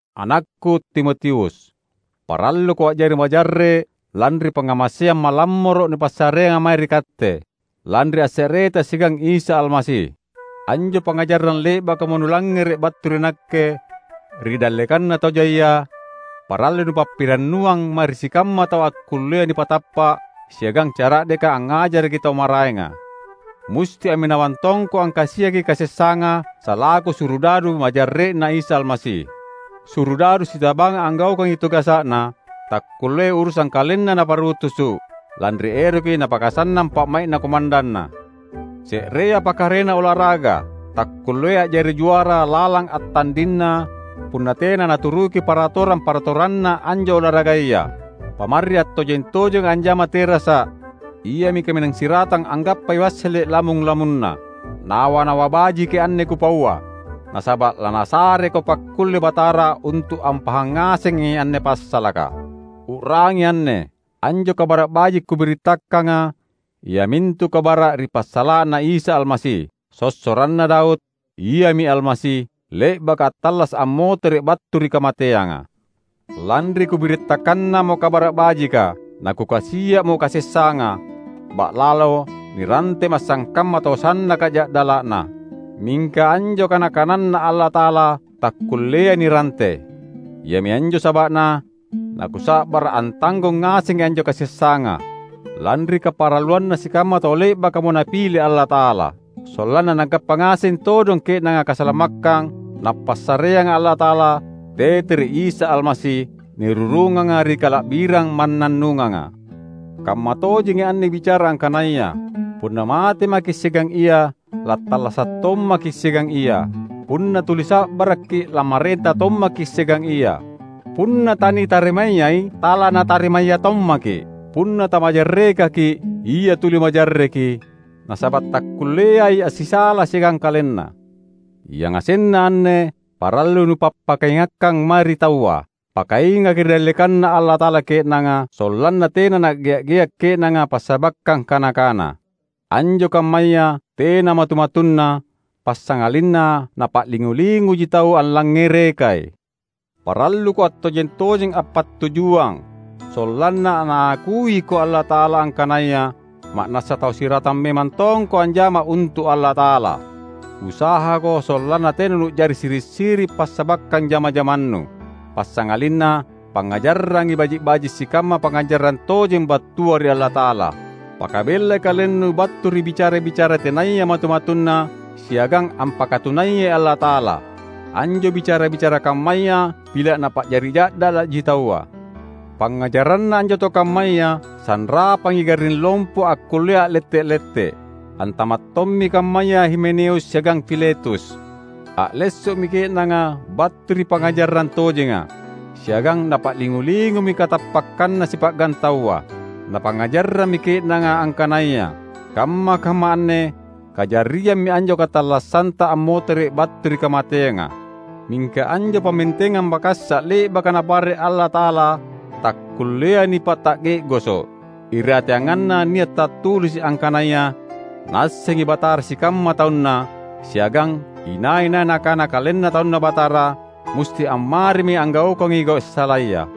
Anakku Timotius! Paralluko a’jari majarre’ lanri pangngamaseang malammoro’ nipassareanga mae ri katte, lanri asse’reta siagang Isa Almasi. Anjo pangngajarang le’bakamo nulangngere’ battu ri nakke ri dallekanna tau jaia, parallui nupappirannuang mae ri sikamma tau akkullea nipatappa’ siagang cara’deka angngajaraki tau maraenga. Musti amminawang tongko angkasiaki kasessanga salaku surudadu majarre’Na Isa Almasi. Surudadu sitabanga anggaukangi tugasa’na, takkulleai urusang kalenna naparutusu’, lanri eroki napakasannang pa’mai’na komandanna. Se’rea pakarena olaraga, takkulleai a’jari juara lalang attandinna punna tena naturuki paratorang-paratoranna anjo olaragaya. Pamarri attojeng-tojenga anjama terasa’, iami kaminang siratang anggappai wassele’ lamung-lamunna. Nawa-nawa bajiki anne kupaua, nasaba’ laNasareko pakkulle Batara untu’ ampahang ngasengi anne passalaka. U’rangi anne: Anjo Kabara’ Baji’ kubirittakanga iamintu kabara’ ri passala’na Isa Almasi, sossoranna Daud; Iami Almasi, le’baka attallasa’ ammotere’ battu ri kamateanga. Lanri kubirittakannamo Kabara’ Bajika, nakukasia’mo kasessanga; ba’lalo nirantema’ sangkamma tau sannaka ja’dala’na. Mingka anjo kana-kananNa Allata’ala takkulleai nirante. Iami anjo saba’na nakusa’bara’ antanggong ngasengi anjo kasessanga, lanri kaparalluanna sikamma tau le’bakamo Napile Allata’ala. Sollanna nagappa ngaseng todong ke’nanga kasalamakkang Napassareanga Allata’ala tete ri Isa Almasi, nirurunganga ri kala’birang mannannunganga. Kammatojengi anne bicara angkanaya, "Punna mate maki’ siagang Ia, lattallasa’ tommaki’ siagang Ia, Punna tuli sa’barakki’ lammarenta tommaki’ siagang Ia. Punna tanitarimayai, talaNatarimaya tommaki’. Punna tamajarrekaki’ Ia tuli majarreki, nasaba’ takkulleai assisala siagang KalenNa." Yangasenna anne parallui nupappakaingakkang mae ri taua. Pakaingaki ri dallekanNa Allata’ala ke’nanga sollanna tena na’gea’-gea’ ke’nanga passabakkang kana-kana. Anjo kammaya tena matu-matunna, passangalinna napa’lingu-linguji tau allangngerekai. Paralluko attojeng-tojeng appattujuang sollanna Naakuiko Allata’ala angkanaya ma’nassa tau siratang memang tongko anjama untu’ Allata’ala. Usahako sollanna tena nu’jari siri’-siri’ passabakkang jama-jamannu; passangalinna pangngajarrangi baji’-baji’ sikamma pangngajarang tojeng battua ri Allata’ala. Pakabellai kalennu battu ri bicara-bicara tenaya matu-matunna siagang ampakatunayai Allata’ala. Anjo bicara-bicara kammaya pila’ napa’jari ja’dala’ji taua. Pangngajaranna anjo tau kammaya sanrapangi garring lompo akkullea a’lette’-lette’. Antama’ tommi kammaya Himeneus siagang Filetus. A’lesso’mi ke’nanga battu ri pangngajarang tojenga, siagang napa’lingu-lingumi katappakkanna sipa’gang taua. Napangngajarrammi ke’nanga angkanaya kamma-kamma anne kajariammi anjo katallassanta ammotere’ battu ri kamateanga. Mingka anjo pammentengang makassa’ le’baka Napare’ Allata’ala takkulleai nipata’ge’goso’. Irateanganna nia’ tattulisi’ angkanaya, "Naassengi Batara sikamma taunNa," siagang "Inai-nai nakana kalenna taunNa Batara, musti ammarimi anggaukangi gau’ salaya".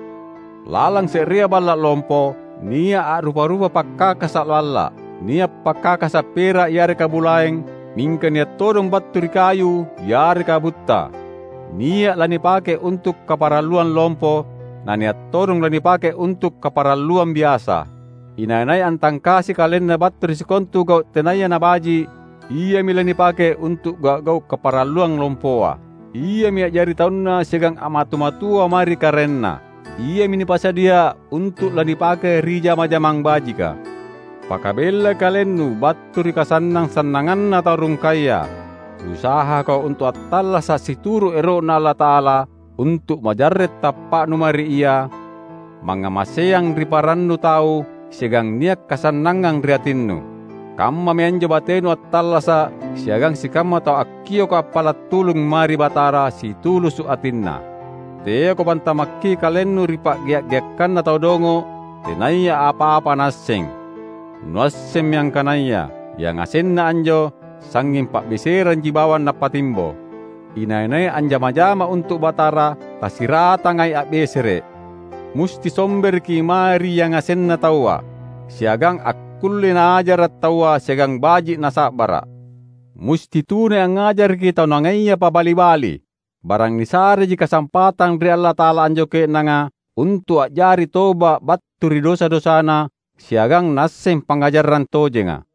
Lalang se’rea balla’ lompo nia’ a’rupa-rupa pakkakasa’ balla’. Nia’ pakkakasa’ pera’ yareka bulaeng, mingka nia’ todong battu ri kayu yareka butta. Nia’ lanipake untu’ kaparalluang lompo, na nia’ todong lanipake untu’ kaparalluang biasa. Inai-nai antangkasi kalenna battu ri sikontu gau’ tenaya nabaji’ iami lanipake untu’ gau’-gau’ kaparalluang lompoa. Iami a’jari taunna siagang a’matu-matua mae ri karaenna. Iami nipasadia untu’ lanipake ri jama-jamang bajika. Pakabellai kalennu battu ri kasannang-sannanganna tau rungkaya. Usahako untu’ attallasa’ situru’ ero’Na Allata’ala, untu’ majarre’ tappa’nu mae ri Ia, mangngamaseang ri parannu tau siagang nia’ kasannangang ri atinnu. Kammami anjo batenu attallasa’ siagang sikamma tau akkioka appala’ tulung mae ri Batara situlusu’ atinna. Teako pantamakki kalennu ri pa’gea’-geakkanna tau dongo’ tenaya apa-apa naasseng. Nuassemmi angkanaya yangasenna anjo sangnging pa’beseranji bawang napattimbo. Inai-nai anjama-jama untu’ Batara tasiratangai a’besere’; musti sombereki mae ri yangasenna taua, siagang akkullei naajara’ taua siagang baji’ na sa’bara’. Musti tunai angngajaraki tau nangaia pabali-bali; barang nisareji kasampatang ri Allata’ala anjo ke’nanga untu’ a’jari toba’ battu ri dosa-dosana siagang naasseng pangngajarang tojenga.